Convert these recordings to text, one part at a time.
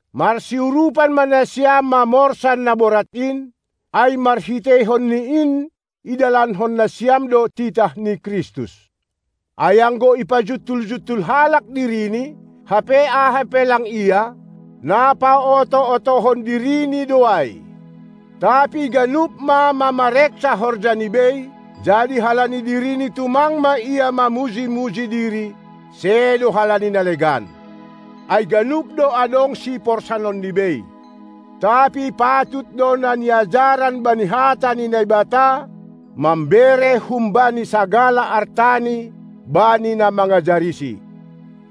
Marsiurupan ma nasiam, mamorsan na borat in, ai marhiteihon ni in idalankon nasiam do titah ni Kristus. Ai anggo ipajuntul-juntul halak dirini, hape aha pe lang ia, na paoto-otohon dirini do ai. Tapi ganup ma mamareksa horjani bei; jadi halani dirini tumang ma ia mamuji-muji diri, sedo halani na legan, ai ganup do adong siporsanonni bei. Tapi patut do na niajaran bani Hata ni Naibata mambere humbani sagala artani bani na mangajarisi.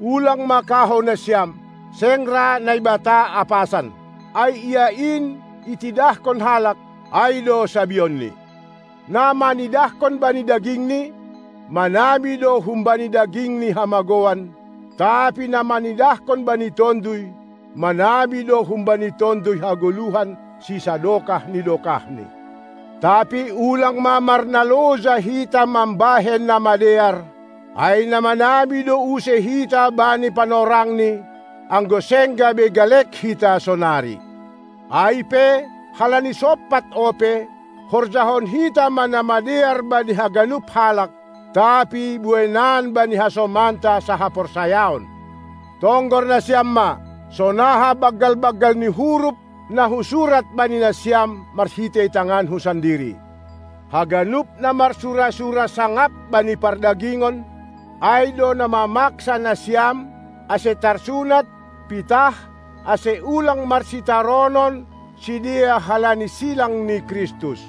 Ulang ma kahou nasiam, seng ra Naibata apasan! Ai ia in itidahkon halak, ai do sabionni. Na manidahkon bani dagingni, manabi do humbani dagingni hamagouan; tapi na manidahkon bani tonduy, manabi do humbani tonduy hagoluhan sisadokah ni dokahni. Tapi ulang ma marnaloja hita mambahen na madear, ai na manabi do use hita bani panorangni, anggo seng gabe galek hita sonari. Ai pe, halani sompat ope, horjahon hita ma na madear bani haganup halak, tapi bueinan bani hasomanta sahaporsayaon. Tonggor nasiam ma, sonaha banggal-banggal ni huruf na husurat bani nasiam marhitei tanganku sandiri. Haganup na marsura-sura sangap bani pardagingon, ai do na mamaksa nasiam ase tarsunat, pitah, ase ulang marsitaronon sidea halani silang ni Kristus.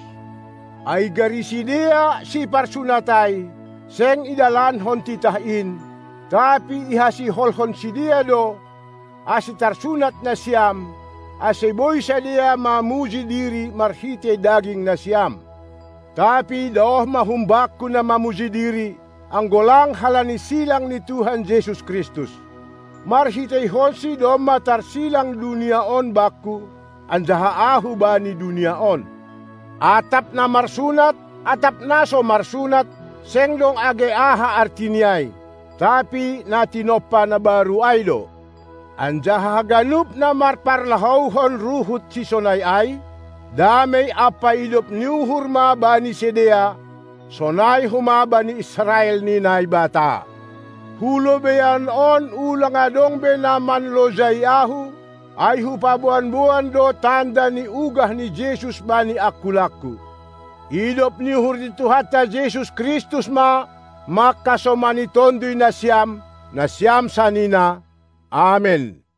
Ai gari sidea, siparsunat ai, seng idalankon titah in, tapi ihasiholhon sidea do, ase tarsunat nasiam, ase boi sidea mamuji diri marhitei daging nasiam. Tapi daoh ma humbakku na mamuji diri, anggo lang halani silang ni Tuhan Jesus Kristus! MarhiteihonSi domma tarsilang dunia on bakku, anjaha ahu bani dunia on. Atap na marsunat atap na so marsunat, seng dong age aha artini ai, tapi na tinompa na baru ai do. Anjaha haganup na marparlahouhon ruhut sisonai ai, damei ampa idop ni uhur ma bani sidea, sonai homa bani Israel ni Naibata. Hu lobeian on ulang adong be na manlojai ahu, ai hupaboan-boan do tanda ni ugah ni Jesus bani angkulangku. Idop ni uhur ni Tuhanta Jesus Kristus ma mangkasomani tonduy nasiam, nasiam sanina! Amen.